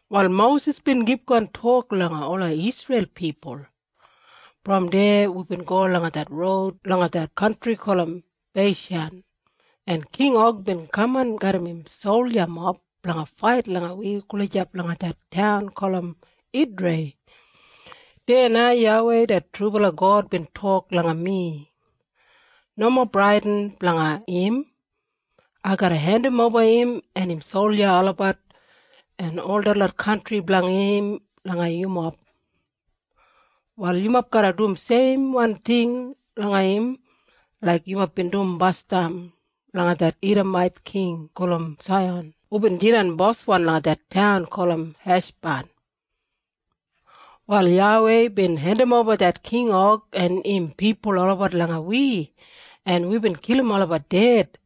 Wal Mosis bin kipgon tok langa ola Isreil pipul, “Brom deya wibin go langa det roud langa det kantri gulum Beishan, en King Og bin kaman garram im soljamob blanga fait langa wi gulijap langa det taun gulum Idrei. Deya na YAWEI det trubala God bin tok langa mi. ‘Nomo bradin blanga im. Ai garra hendimoba im, en im solja olabat, en ol detlot kantri blanga im langa yumob. Wal yumob garra dum seimwan ting langa im laik yumob bin dum basdam langa det Idamait king gulum Saihan hubin jidan boswan langa det taun gulum Heshban.’ “Wal YAWEI bin hendimoba det King Og en im pipul olabat langa wi, en wibin kilim olabat ded.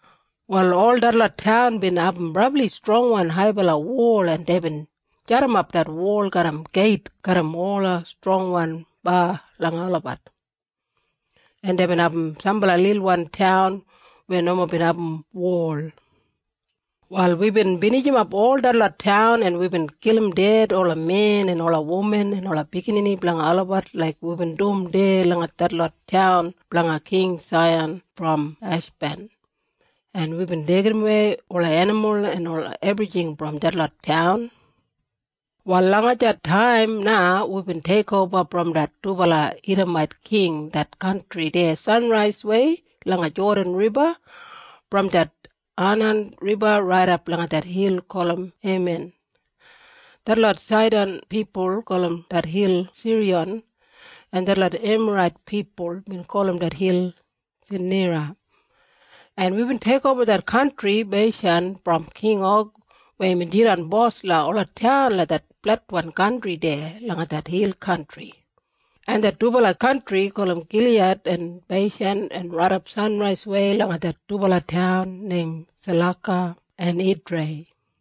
Wal ol detlot taun bin abum brabli strongwan haibala wol en deibin jadimap det wol garram geit garram ola strongwan ba langa olabat. En deibin abum sambala lilwan taun weya nomo bin abum wol. Wal wibin binijimap ol detlot taun en wibin kilim ded ola men en ola wuman en ola biginini blanga olabat laik wibin dum deya langa detlot taun blanga King Saihan brom Heshban. En wibin deigimwei ola enimul en ola ebrijing brom detlot taun. “Wal langa det taim na wibin teikoba brom det dubala Idamait king det kantri deya sanraiswei langa Jodan Riba, brom det Anan Riba raidap langa det hil gulum Heman. Detlot Saidan pipul gulum det hil Siriyon, en detlot Emarait pipul bin gulum det hil Senira. En wibin teikoba det kantri Beishan brom King Og weya imbin jidan bos langa ola taun langa det fletwan kantri deya langa det hil kantri, en det dubala kantri gulum Giliyad en Beishan en raidap sanraiswei langa det dubala taun neim Salaka en Idrei.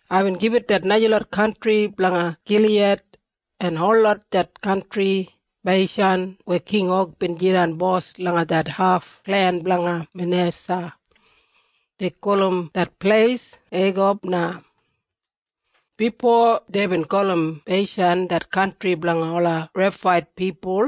Aibin gibit det najalot kantri blanga Giliyad, en holot det kantri Beishan weya King Og bin jidan bos langa det haf klen blanga Manesa. Dei gulum det pleis Egob na. “Bifo deibin gulum Beishan det kantri blanga ola Refait pipul.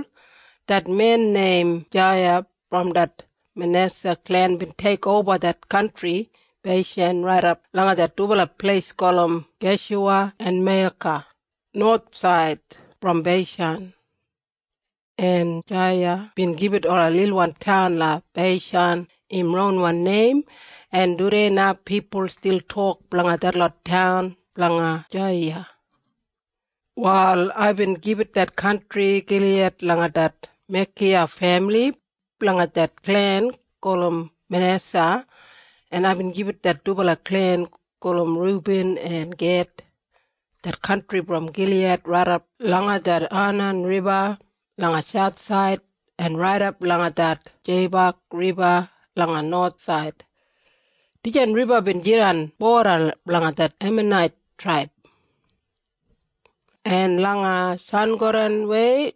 Det men neim Jaiya brom det Manesa klen bin teikoba det kantri Beishan raidap langa det dubala pleis gulum Geshuwa en Meiyaka, nowathsaid brom Beishan. En Jaiyiya bin gibit ola lilwan taun langa Beishan im ronwan neim, en tudei na pipul stil tok blanga detlot taun blanga Jaiyiya. “Wal aibin gibit det kantri Giliyad langa det Mekiya femili, blanga det klen gulum Manesa. En aibin gibit det dubala klen gulum Rubin en Ged, det kantri brom Giliyad raidap langa det Anan Riba langa sauthsaid en raidap langa det Jeibak Riba langa nowathsaid. Dijan riba bin jidan boda blanga det Emanait traib. En langa sangodanwei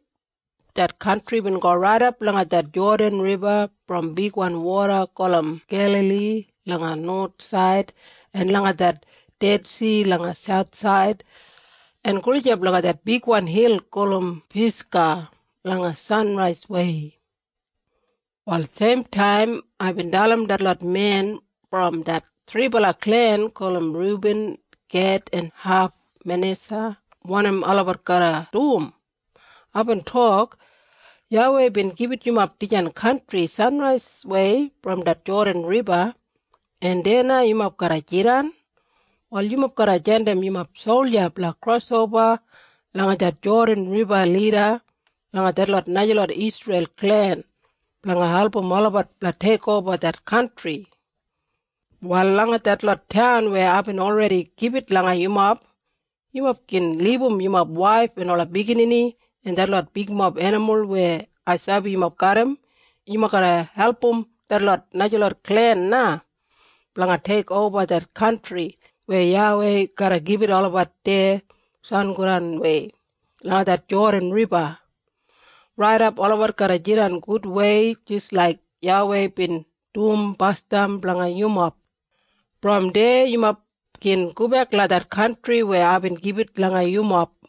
det kantri bin go raidap langa det Jodan Riba brom bigwan woda gulum Gelali langa nowathsaid en langa det Dedsi langa sauthsaid en gulijap langa det bigwan hil gulum Pisga langa sanraiswei. “Wal seimtaim aibin dalim detlot men brom det thribala klen gulum Rubin, Ged en haf Manesa wanim olabat garra dum. Aibin tok, ‘YAWEI bin gibit yumob dijan kantri sanraiswei brom det Jodan Riba, en deya na yumob garra jidan. Wal yumob garra jandim yumob solja blanga krosoba langa det Jodan Riba lida langa detlot najalot Isreil klen blanga album olabat blanga teikoba det kantri. Wal langa detlot taun weya aibin olredi gibit langa yumob, yumob gin libum yumob waif en ola biginini en detlot bigmob enimul weya ai sabi yumob garram. Yumob garra album detlot najalot klen na blanga teikoba det kantri weya YAWEI garra gibit olabat deya sangodanwei langa det Jodan Riba, raidap olabat garra jidan gudwei jis laik YAWEI bin dum basdam blanga yumob. Brom deya yumob gin gobek langa det kantri weya aibin gibit langa yumob.’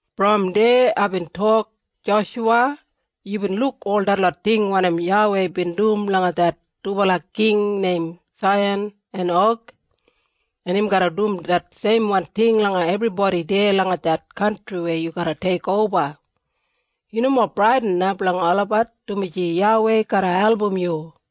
“Brom deya aibin tok, ‘Joshuwa, yubin luk ol detlot ting wanim YAWEI bin dum langa det dubala king neim Saihan en Og, en im garra dum det seimwan ting langa ebribodi deya langa det kantri weya yu garra teikoba. Yu nomo bradin na blanga olabat, dumaji YAWEI garra album yu.’”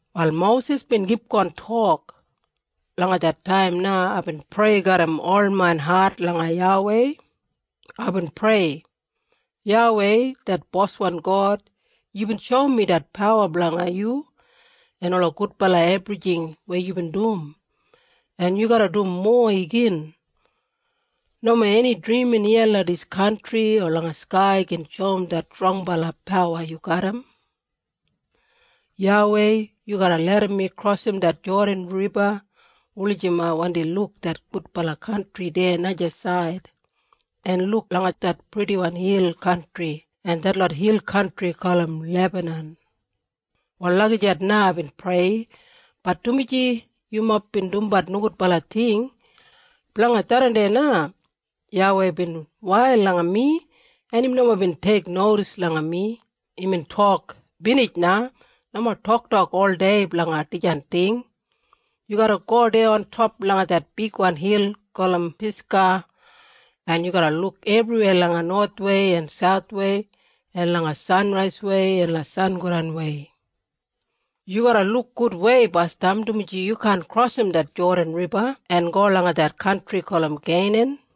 Wal Mosis bin kipgon tok, “Langa det taim na aibin prei garram ol main hat langa YAWEI. Aibin prei, ‘YAWEI det boswan God, yubin shoum mi det pawa blanga yu en ola gudbala ebrijing weya yubin dum, en yu garra dum mowa igin. Nomo eni drimin iya langa dis kantri o langa skai gin shoum det strongbala pawa yu garram. YAWEI, yu garra larram mi krosim det Jodan Riba wulijim ai wandi luk det gudbala kantri deya najasaid, en luk langa det purdiwan hil kantri en detlot hil kantri gulum Lebanan.’ “Wal lagijat na aibin prei, bat dumaji yumob bin dumbat nogudbala ting, blanga tharran na YAWEI bin wail langa mi en im nomo bin teiknodis langa mi. Imbin tok, ‘Binij na! Nomo toktok oldei blanga dijan ting! Yu garra go deya ontop langa det bigwan hil gulum Pisga en yu garra luk ebriweya langa nowathwei en sauthwei, en langa sanraiswei en sangodanwei. Yu garra luk gudwei basdam dumaji yu kaan krosim det Jodan Riba en go langa det kantri gulum Keinan.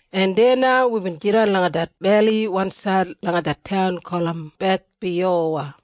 “En deya na wibin jidan langa det beli wansaid langa det taun gulum Bethpiyowa.”